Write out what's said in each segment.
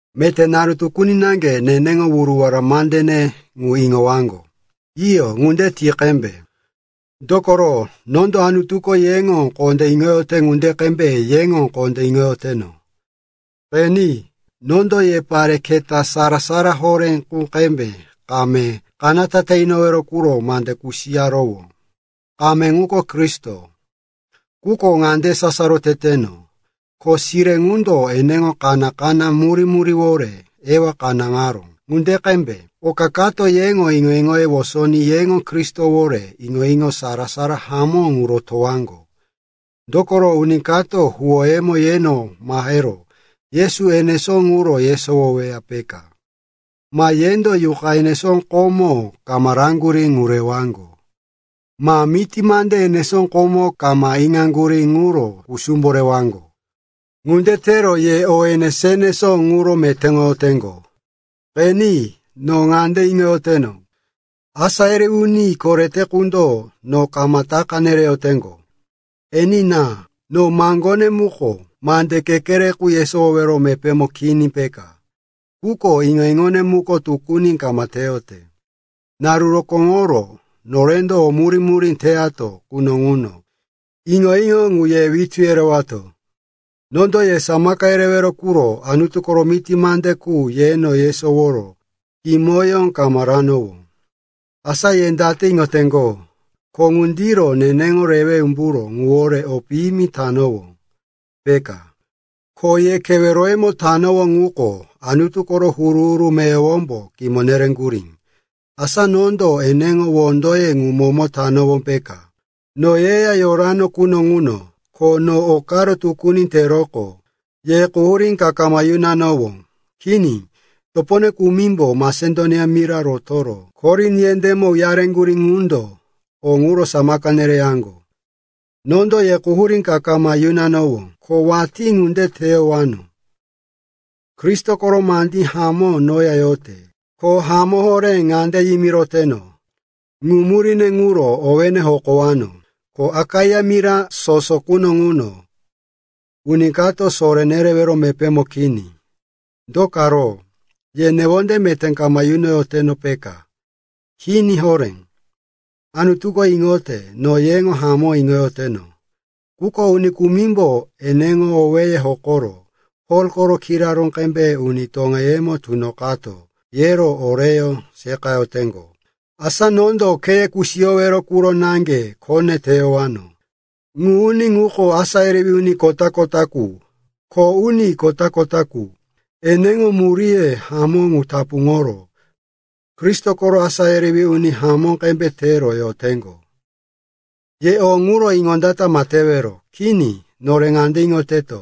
Meté naru tukuni naŋge neneŋo wuruwara mandene ŋu iŋowaŋgo. Iyo, ŋunde ti qembe. Dokoro nondo Anutuko yeŋo kondé iŋoyote ŋunde qembe yeŋo kondé iŋoyoteno. Qeni, nondo ye pare keta sara-sara horé qu qembe kame kanata te inowero quro mande kusiyarowó. Kame ŋuko Kristo. Quko ŋande sasaro teteno, ko sire ŋundo eneŋo kaná-kaná murí-muríwore Ewa kanáŋaró ŋunde qembe, oka kato yeŋo iŋo-iŋoye wosoní yeŋo Kristowore iŋo-iŋoye sara-sara hamó ŋu rotowaŋgo. Dokoro uni kato huwónemo yeno mahero Yesu enesó ŋuro yesowoweya, peka. Ma yendo yuqa enesó komo kama raŋgurí ŋu rewaŋgo. Ma miti mande enesó komo kama iŋaŋgurí ŋuro kusumbo rewaŋgo. Ŋunde tero ye o enesó-enesó ŋuro metéŋoyoteŋgo. Qeni, no ŋande iŋoyoteno, “asá yerewí uni korete” qundo no kama taka nereyoteŋgo. Enina, no maŋgone muko mande kekere qu yesowowero mepémo kini peka, quko iŋo-iŋone muko tukuni kama teyote. Naru rokóŋoro norendo o murí-murí teyato quno ŋuno, iŋo-iŋo ŋu ye witú yereyatowó. Nondo ye samaka yerewero quro Anutu koro miti mande qu yeno yesoworo kimoyó kama ranowó. Asa ye date iŋoteŋgo, ko ŋundiro neneŋo rewe umburó ŋuwore o piyimi tanowó, peka? Kho ye keweroyemo tanowó ŋuko, Anutu koro huru-huru meyowombo kimo nereŋgurí. Asa nondo eneŋo wondoye ŋu momo tanowó, peka? No yeya yorano quno ŋuno, ko no okaro tukuni teroqo, ye quhurí ka kama yunoyano. Kini. Topone kumimbo Masedonia mira rotoro Korin yendémo uyareŋgurí ŋundo o ŋuro samaka nereyaŋgo. Nondo ye quhurí ka kama yunanowó, ko watí ŋunde teyowano. Kristo koro mandí hamó noya yote, ko hamó horé ŋande yimiroteno, ŋu muríne ŋuro owéne hokowano, ko Akaia mira soso quno ŋuno uni kato soré nerewero mepémo kini. Do karo? Ye newonde meté kama yunoyoteno, peka? Kini horé. Anutuko iŋote no yeŋo hamó iŋoyoteno. Quko uni kumimbo eneŋo owéye hokoro, Pol koro kiraró qembe uni toŋeyemo tunoqato, yero oreyó seqayoteŋgo. Asa nondo kheye kusiyowero quro naŋge khone teyowano. Ŋu uni ŋuko asá yerewí uni kota-kota qu, kho uni kota-kota qu. Eneŋo muríye hamó ŋu tapuŋoro Kristo koro asá yerewí uni hamó qembe tero yoteŋgo. Ye o ŋuro iŋondata ma tewero. Kini, nore ŋande iŋoteto,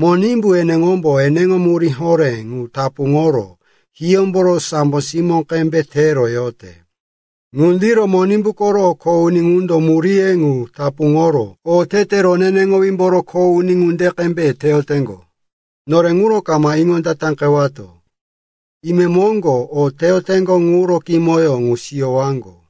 Monimbu eneŋombo eneŋo murí horé ŋu tapuŋoro hiyómboro sambo simó qembe tero yote. Ŋundiro Monimbu koro kho uni ŋundo muríye ŋu tapuŋoro otete roneneŋowímboro kho uni ŋunde qembe teyoteŋgo. Nore ŋuro kama iŋondataqewato. Imemoŋgo o teyoteŋgo ŋuro kimoyó ŋu siyowaŋgo.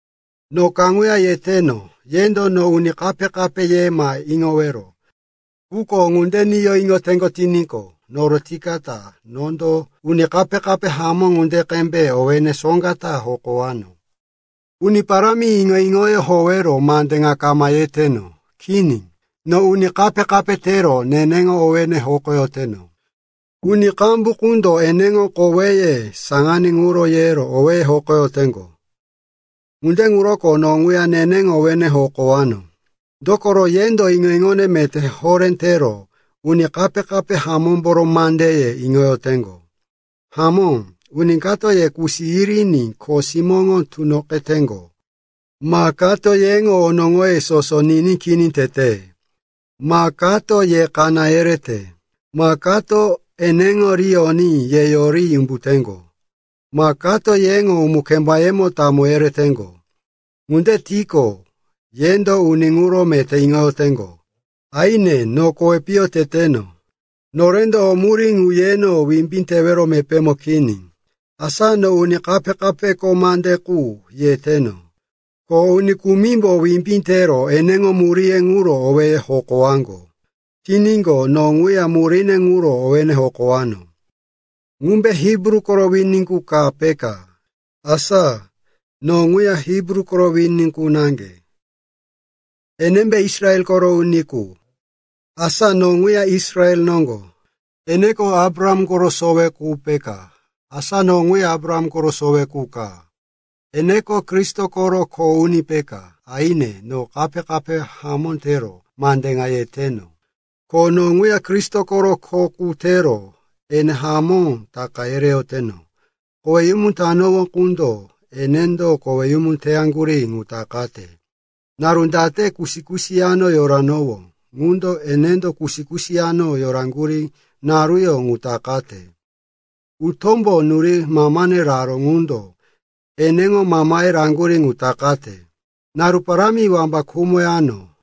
No kaŋuya yeteno, yendo no uni kape-kape ye ma iŋowero. Quko ŋunde niyo iŋoteŋgo tiníqo, norotoyikata nondo uni kape-kape hamó ŋunde qembe owéne soŋga ta hokowano. Uni Parámi iŋo-iŋoyó howero mande ŋa kama yeteno. Kini, no uni kape-kape tero neneŋo owéne hokoyoteno. Uni qambu qundo eneŋo koweye saŋaní ŋuro yero owéye hokoyoteŋgo. Ŋunde ŋuroko no ŋuya neneŋo owéne hokowano. Dokoro yendo iŋo-iŋo meté horé tero uni kape-kape hamómboro mandeye iŋoyoteŋgo. Hamó, uni kato ye kusi yiriní kho simóŋo tunoqeteŋgo, ma kato yeŋo onoŋoye soso ni kini tete, ma kato ye kaná yerete, ma kato eneŋo ri oní ye yoriní umbuteŋgo, ma kato yeŋo umu-kembayemo tamo yereteŋgo. Ŋunde tiqo, yendo uni ŋuro meté iŋoyoteŋgo. Aine, no kowi piyo teteno, norendo o murí ŋu yeno wimbí tewero mepémo kini. Asa no uni kape-kapeko mande qu yeteno, ko uni kumimbo wimbí tero eneŋo muríye ŋuro owéye hokowaŋgo tiníqo, no ŋuya muríne ŋuro owéne hokowano. Ŋumbe Hibru koro wini qu ka peka? Asa, no ŋuya Hibru koro wini qu naŋge. Enembe Israel koro uni qu? Asa, no ŋuya Israel noŋgo. Eneko Abraham koro sowe qu peka? Asa, no ŋuya Abraham koro sowe qu ka. Eneko Kristo koro kho uni peka? Aine, no kape-kape hamó tero mande ŋa yeteno, ko no ŋuya Kristo koro kho qu tero ene hamó taka yereyoteno. Koweyumu tanowó ŋundo enendo koweyumu teyaŋgurí ŋu takate. Naru date kusi-kusi yano yoranowó ŋundo enendo kusi-kusi yano yoraŋgurí naruyó ŋu takate. Utómbo nuroyi mamane raró ŋundo eneŋo mamaye raŋgurí ŋu takate. Naru parámi wamba khumoyano.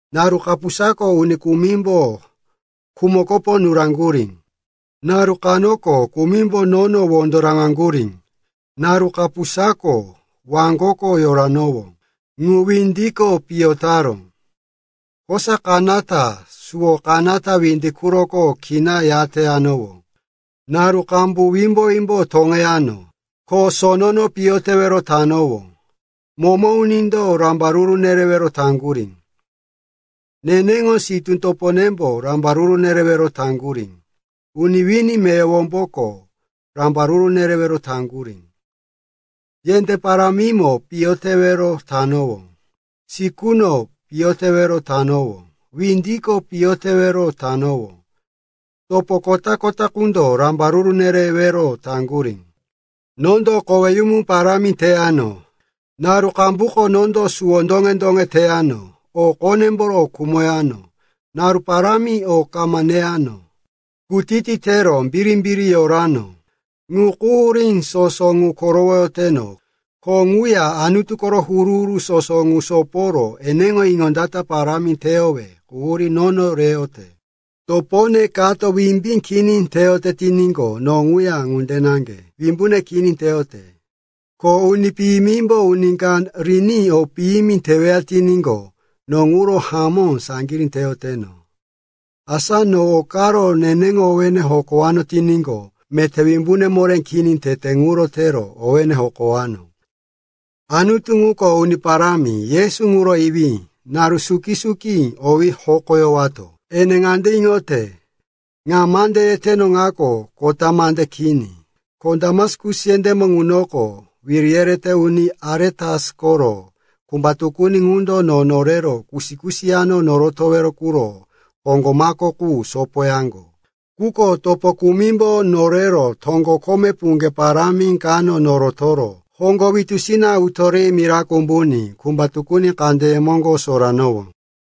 Naru kapusako uni kumimbo kumukopo nuraŋgurí, naru kanoko kumimbo nono wondo raŋaŋgurí, naru kapusako waŋgoko yoranowó ŋu windiko piyo taró, kosa kanata suwo kanata windi quroko kina yateyanowó. Naru qambu wimbo-wimbo toŋeyano, ko sonono piyo tewero tanowó, momo unindo rambaruru nerewero taŋgurí, neneŋo sitú toponembo rambaruru nerewero taŋgurí, uni wini meyowomboko rambaruru nerewero taŋgurí. Yendé parámimo piyo tewero tanowó, sikuno piyo tewero tanowó, windiko piyo tewero tanowó. Topo kota-kota ŋundo rambaruru nerewero taŋgurí. Nondo koweyumu parámi teyano, naru qambuko nondo suwo doŋe-doŋe teyano, o qonemboro khumoyano, naru parámi o kama neyano, kutiti tero birimbiri yorano. Ŋu quhurí soso ŋu korowoyoteno, ko ŋuya Anutu koro huru-huru soso ŋu soporo eneŋo iŋondata parámi teyowe quhurí nono reyote. Topone kato wimbí kini teyote tiníqo, no ŋuya ŋunde naŋge wimbune kini teyote. Ko uni piyimimbo uni ka riní o piyimi teweya tiníqo, no ŋuro hamó saŋgirí teyoteno. Asa no okaro neneŋo owéne hokowano tiníqo, meté wimbune moré kini tete ŋuro tero owéne hokowano. Anutu, ŋuko Uni Parámi Yesu ŋuro Iwí, naru suki-suki owí hokoyowato, ene ŋande iŋote, ŋa mande yeteno ŋako kota mande kini. Ko Damaskus yendémo ŋunoko, wiri yerete uni Aretas koro kumba tukuni ŋundo no norero kusi-kusi yano norotowero quro hoŋgo mako qu sopoyaŋgo. Quko topo kumimbo norero toŋgo kome puŋge parámi kano norotoro hoŋgo witusina utó ri mirako umbuní kumba tukuni kandeye moŋgo soranowó.